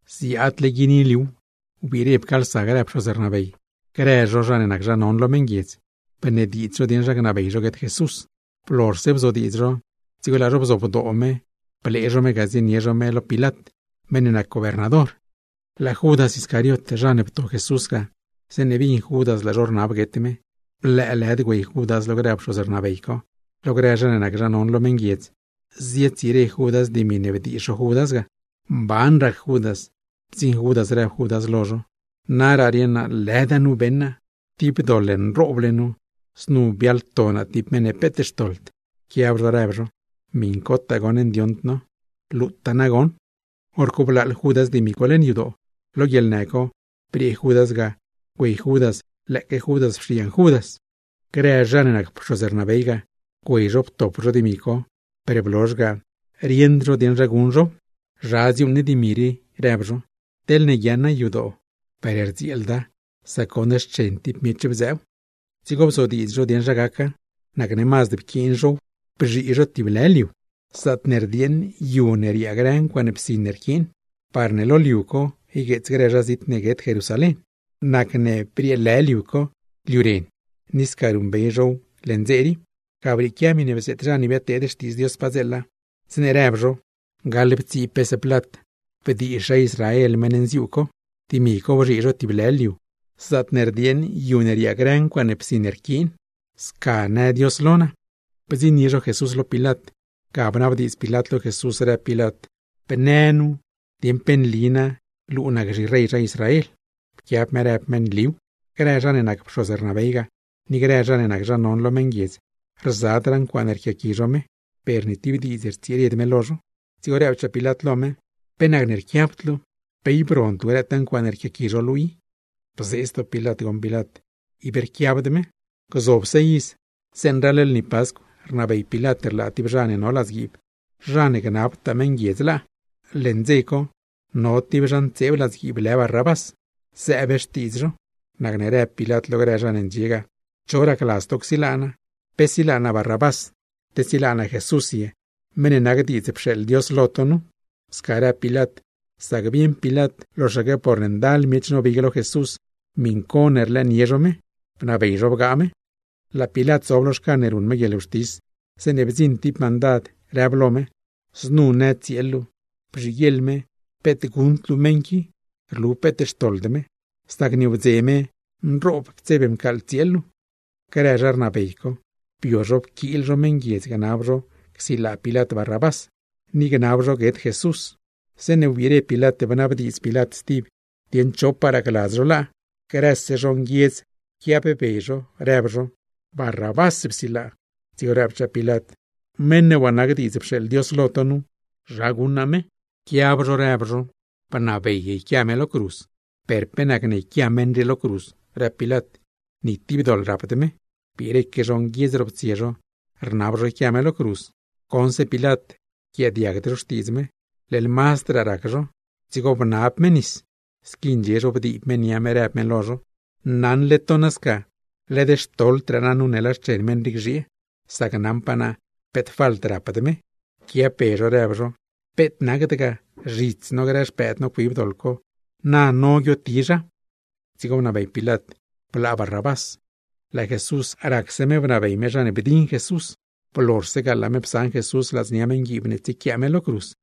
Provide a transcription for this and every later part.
Ziadyiinile liuw, wbiire pcaalsa grë pxoz rnabey, grë zha non lo meṉguiedz, bnediidz zho dieṉ zha gnabey zho guet Jesús. Blozhse bzodiidz zho, dzigo laa zho bzobdoo me blee zho me ga ziesaṉ zho me lo Pilat, meṉ ne nac gobernador. Laa Judas Iscariot zha ne pto Jesús ga, zeeṉe bin Judas laa zho rnab guet me, lëëlëd güey Judas lo grë pxoz rnabey co, lo grë zha non lo meṉguiedz ga, zietsire Judas dimi ne bdiizh zho Judas ga. Mban rac Judas, bdziṉ Judas rëb Judas lo zho: ―Naraa rieṉ naa lëda nu beṉ naa. ¡Tib doḻ nrooble nu, znu biaḻto naa tib meṉ ne peet xtoḻd! Pquiab zho rëb zho: ―¡Miṉcotaa goṉ ndioṉd no! ¡Xcuentzhe luu ga! Horco pcheḻ Judas dimi co leṉ yadoo. Lo guieḻnë co briee Judas ga güey Judas lëëque Judas pxiiyaṉ Judas. Grë zha ne nac pxoz rnabey ga, güey zho ptop zho dimi co. Per blozh ga, rieṉd zho dieṉ zha guṉ zhow. ―¿Zha dziuuṉ ne dimi rii? ―rëb zho―. Teḻne guiaaṉa yadoo, per rdzieelda, sac goṉ xchen tib miech bdzëëw. Dzigo bzodiidz zho dieṉ zha gaca, nacne mazd pquiin zhow bzhii zho tib lë liu, zaatne rdieeṉ yu ne riaa grë ncuaaṉ psin ne rquiin; parne lo liu co ygueets grë zha zit ne guet Jerusalén. Nacne brieelë liu co “Liu ren”, ni sca ruṉbey zhow leṉ dze rii. Ga brieequia miṉe bzeet zha ne biadteed xtiidz Dios padzeela, zeeṉe rëb zho: “Gaḻptsii pes plat ne bzhii zha Israel meṉ nziuu co, dimi co bzhii zho tib lë liu, zaatne rdieeṉ yu ne riaa grë ncuaaṉ psin ne rquiin. Sca në Dios lo naa.” Bdziṉnie zho Jesús lo Pilat, ga bnabdiidz Pilat lo Jesús rëb Pilat: ―Bnë dieṉ, ¿pe nli luu nac zhirey zha Israel? Pquiab me rëb me: ―Nliw. Grë zha ne nac pxoz rnabey ga, ni grë zha ne nac zha non lo meṉguiedz, rzadraa ncuaaṉe rquiaqui zho me; per ni tib diidz rtsired me lo zho. Dzigo rëbchaa Pilat lo me: ―¿Pe nacne rquiabd luu? ¿Pe ib rond luu grëtaa ncuaaṉe rquiaqui zho luu i? Bzee zdoo Pilat goṉ Pilat, ible rquiabd me. Gzobse iz, zeeṉe raḻ lni Pascw rnabey Pilat rlaa tib zha ne no ladzguiib, zha ne gnabtaa meṉguiedz laa. Leṉ dze co no tib zha ntseeb ladzguiib lë Barrabás, zëëb xtiidz zho. Nacne rëb Pilat lo grë zha ne ndxie ga: ―¿Cho racladz to csilaa naa? ¿Pe silaa naa Barrabás, te silaa naa Jesús ye, meṉ ne nac diidz pxeeḻ Dios lo to? Sca rëb Pilat sac bieṉ Pilat loxaque porne ndal miech nobig lo Jesús miṉ co ne rlëënie zho me, bnabey zho bgaa me. Laa Pilat zob lo xcan ne ruṉ me guieḻwxtis, zeeṉe bdziṉ tib mandad rëb lo me: ―Znu në tsieel luu: bzhiguieḻ me peet guṉd luu meṉ qui, rlu peet xtoḻd me; sac nieewdze me nroob ptseb mcaaḻ tsieel luu. Grë zha rnabey co, bio zho pquiil zho meṉguiedz gnab zho csilaa Pilat Barrabás, ni gnab zho guet Jesús. Zeeṉe wbiire Pilat bnabdiidz Pilat stib, dieṉ chopaa racladz zho laa, grëse zho nguiedz pquiab be zho, rëb zho: ―¡Barrabás psilaa! Dzigo rëbchaa Pilat: ―Meṉ ne waa nac diidz pxeeḻ Dios lo to nu, ¿zha guṉ naa me? Pquiab zho rëb zho: ―¡Bnabey yquia me lo cruz! ―¿Per pe nacne yquia meṉ rii lo cruz? ―rëb Pilat―. ¡Ni tib doḻ rapd me! Biireque zho nguiedz roptsie zho rnab zho yquia me lo cruz. Goṉse Pilat rquiaadiagd zho xtiidz me, leḻ mazdraa rac zho, dzigo bnab me nis, squi ndxie zho bdiib me nia me, rëb me lo zho: ―¡Naṉle to nasca, led xtoḻdraa naa nu ne laa xchen meṉ rii gzhiee, sac naṉpaa naa peet falt rapd me! Pquiab be zho rëb zho: ―¡Peet nacd ga! ¡Zhits no grë xpëëd no cuib doḻ co, na no guiotizha! Dzigo bnabey Pilat blaa Barrabás, laa Jesús racse me bnabey me zha ne bdiṉ Jesús, blozhse ga laa me psaṉ Jesús ladznia meṉguiib ne tsiequiaa me lo cruz.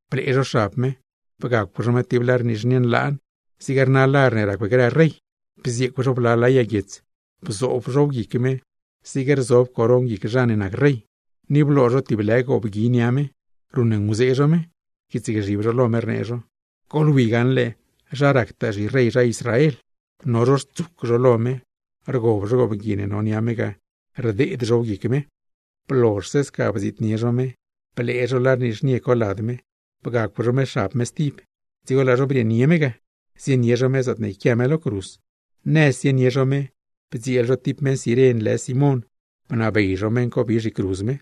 Blee zho xab me, bgacw zho me tib lar nizhnie nlaan, zig rna lar ne racw grë rey, bzieecw zho bla lë yag guiets, bzoob zhow guic me zig rzob coron guic zha ne nac rey, ni bloo zho tib lë goobgui nia me. Ruṉnguzee zho me, rquiitsgzhib zho lo me, rnee zho: ―¡Goḻwi gaṉle zha ractaa zhirey zha Israel! No zho rtsuc zho lo me, rgob zho goobgui ne no nia me ga, rdeed zhow guic me. Blozhse sca bdziitnie zho me, blee zho lar nizhnie co lad me, bgacw zho me xab me stib, dzigo laa zho brieenie me ga zienie zho me zaatne yquia me lo cruz. Nëz zienie zho me bdzieel zho tib meṉ Ciren lë Simón, bnabey zho meṉ co bi me zhicruz me.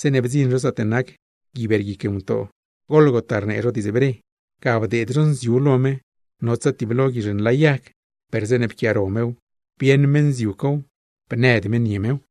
Zeeṉe bdziṉ zho zaatne nac “Gui Beerguic Ngutoo” (Gólgota), ga bdeed zho nziu lo me notsa tiblo guizh nlayag, per zeeṉe pquiaaro mew bieṉ me nziu cow, bnëd me nie mew.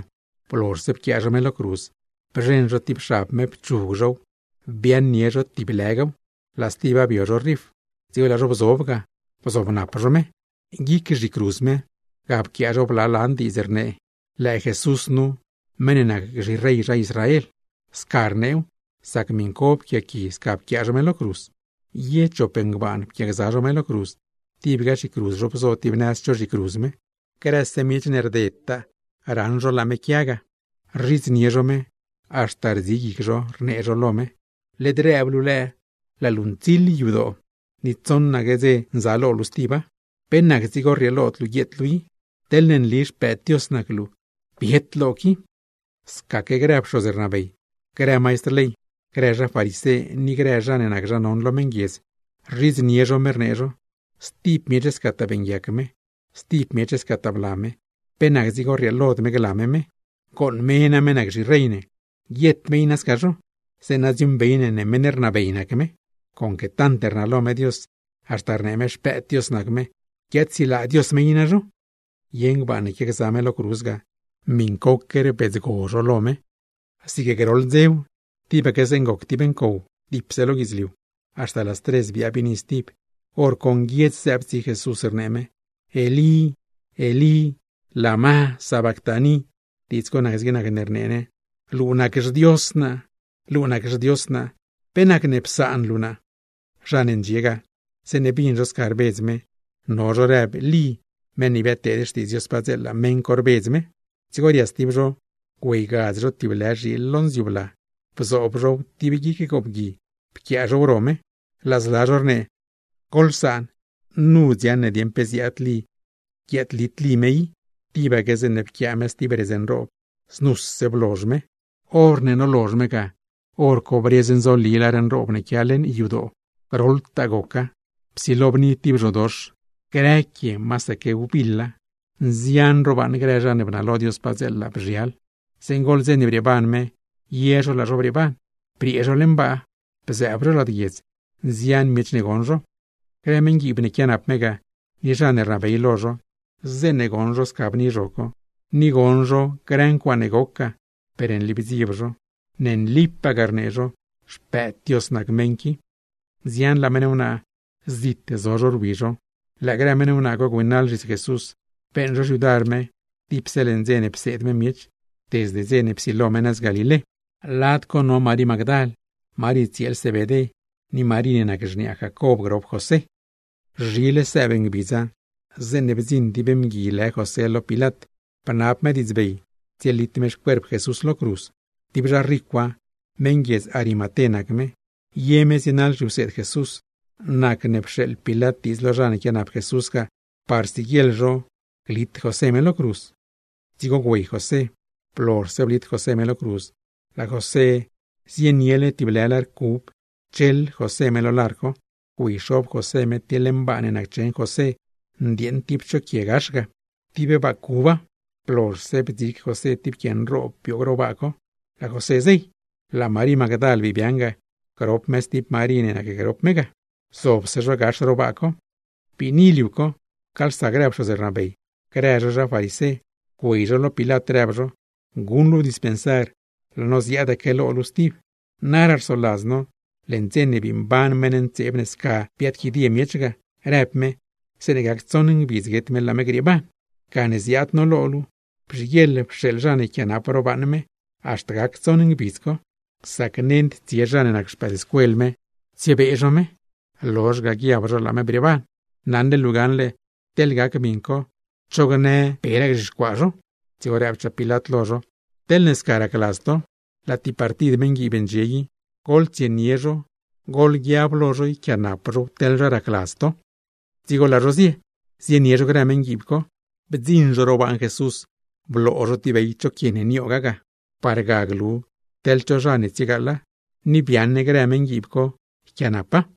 Blozhse pquiaa zho me lo cruz, bzheṉ zho tib xab me pchug zhow biaaṉnie zho tib lëgaw, laa stiba bio zho rif; dzigo laa zho bzob ga, bzobnap zho. Guic zhicruz me, ga pquiaa zho bla lan diidz zaatne rnee: “LËË JESUS NU, MEṈ NE NAC ZHIREY ZHA ISRAEL.” Sca pquiaa zho, sac miṉco pquiaqui sca pquiaa zho me lo cruz. Ye chop ngbaan pquiaagza zho me lo cruz, tibga zhicruz zho bzo tib nëz cho zhicruz me. Grëse miech ne rdedtaa raṉ zho laa me quia ga, rzhidznie zho me, haxta rdzi zho guic zho rnee zho lo me: ―Led rëb luu lëë laa luu ntsiḻ yadoo, ni tsoṉaque ngbidz nzaalo luu stiba, ¿pe nac dzigo rrieelod luu guieet luu i? Teḻne nli Xpëëd Dios nac luu, biet lo qui. Scaque grë pxoz rnabey, grë maistr ley, grë zha farisé ni grë zha ne nac zha non lo meṉguiedz, rzhidznie zho me, rnee zho: ―Stib miech scataa beeṉguiac me, stib miech scataa bla me, ¿pe nac dzigo rrieelod me gla me me? ¡Gooṉ me name nac zhirey ne, guiet me i sca zho; zeeṉa dziuuṉbey ne meṉ rnabey nac me! ¡Conque tant rnalo me Dios, haxta rnee me Xpëëd Dios nac me, guiaadsilaa Dios me i nazho! Ye ngbaan ne quiagza me lo cruz ga, miṉcoque rbidzgo zho lo me. Zig groḻ dzew, tibaque zeeṉ goc tib ncow dipse lo guidzliu, haxta las tres biaa biini stib. Horco nguiedz zëëb tsi Jesús, rnee me: ―Elí, Elí. ¿Lama sabactani? Diidz co nac zig nac ne rnee ne: Luu nac xDios naa, luu nac xDios naa. ¿Pe nacne psaan luu naa? Zha ne ndxie ga, zeeṉe bin zho sca rbedz me, no zho rëb Lí, meṉ ne biadteed xtiidz Dios padzeela, meṉ co rbedz me. Dzigo rias tib zho güeygadz tib lë zhiil lo nziu bla, bzoob zhow tib guic goobgui pquiaa zhow ro me. Laa zla zho rnee: ―Psaan, nu dziaṉ ne dieṉ pe ziaad Lí guiaadlit Lí me i. Tibaque zeeṉe pquiaa me stib redz nroob, znuse blozh me. Horne nolozh me ga, hor co briez nzoli lar nroob ne quia leṉ yadoo, groḻtaa goca; psilo bni tib zhodox, grë quie masaque wbiḻa, nzian ro baaṉ grë zha ne bnalo Dios mazd padzeela bzhial. Zeeṉ goḻ dze ne brieeban me, ye zho laa zho brieeban, briee zho leṉ baa, bzëëb zho lad guiedz; nzian miech ne goṉ zho. Grë meṉguiib ne quianap me ga, ni zha ne rnabey lo zho, zeeṉe goṉ zho bni zho co, ni goṉ zho grë ncuaaṉe goc ga, per nli bdzieb zho. ―¡Ne nlipagaa ―rnee zho―, Xpëëd Dios nac meṉ qui! Nzianlaa meṉ wnaa, zit zo zho rwi zho. Lëë grë meṉ wnaa co güeynaḻ zhits Jesús, beeṉ zho xyudar me dipse leṉ dze ne pseed me miech, desde dze ne psilo me nëz Galilé. Lad co no Marí Magdal, Marí tsieel Zebedé, ni Marí ne nac xniaa Jacob grop José. Zhile sëëb ngbidza, zeeṉe bdziṉ tib mgui lë José lo Pilat, bnab me diidzbey tsielit me xcuerp Jesús lo cruz; tib zha ricwa, meṉ guiedz Arimaté nac me, ye me zienaḻ zhiwseed Jesús. Nacne pxeeḻ Pilat diidz lo zha ne quianap Jesús ga, parne siguieḻ zho glit José me lo cruz. Dzigo güey José. Blozhse blit José me lo cruz, laa José neyle tib lë lar cub, pcheḻ José me lar co, güeyxob José me tib leṉ baa ne naccheṉ José ndieeṉ tib cho quie gax ga; tib baa cuba. Blozhse bdzig José tib quie nroob bioog ro baa co, laa José zey. Laa Marí Magdal bii biaaṉ ga, grop me stib Marí ne nacgrop me ga; zobse zho gax ro baa co. Biini liu co, pcaalsa grë pxoz rnabey, grë zho zha farisé, güey zho lo Pilat, rëb zho: ―Guṉ luu dispensar, laa no ziaadaque lo luu stib. Naraa rsoladz no, leṉ dze ne bii mban meṉ ntseeb ne sca biaadquidie miech ga, rëb me, zeeṉe gac tsoṉ ngbidz guet me laa me grieeban. Gane ziaad no lo luu, bzhiguieḻ pxeeḻ zha ne yquiaanap ro baaṉ me haxta gac tsoṉ ngbidz co; sac nend tsie zha ne nac xpëëdscuel me tsiebee zho me, lozh ga guiab zho laa me brieeban. Naṉle luu gaṉle, teḻ gac miṉ co, cho gnë peraa gzhixcuaa zho. Dzigo rëbchaa Pilat lo zho: ―Teḻne sca racladz to, laa tib partid meṉguiib ndxie i. Goḻtsienie zho, goḻguiab lo zho yquiaanap zhow teḻ zha racladz to. Dzigo laa zho zie zienie zho grë meṉguiib co. Bdziṉ zho bloo zho tib bey cho quie ne nioog ro baaṉ Jesús ga, par glu teḻ cho zha ne tsiegaaḻa, ni biaaṉ grë meṉguiib co yquiaanapa.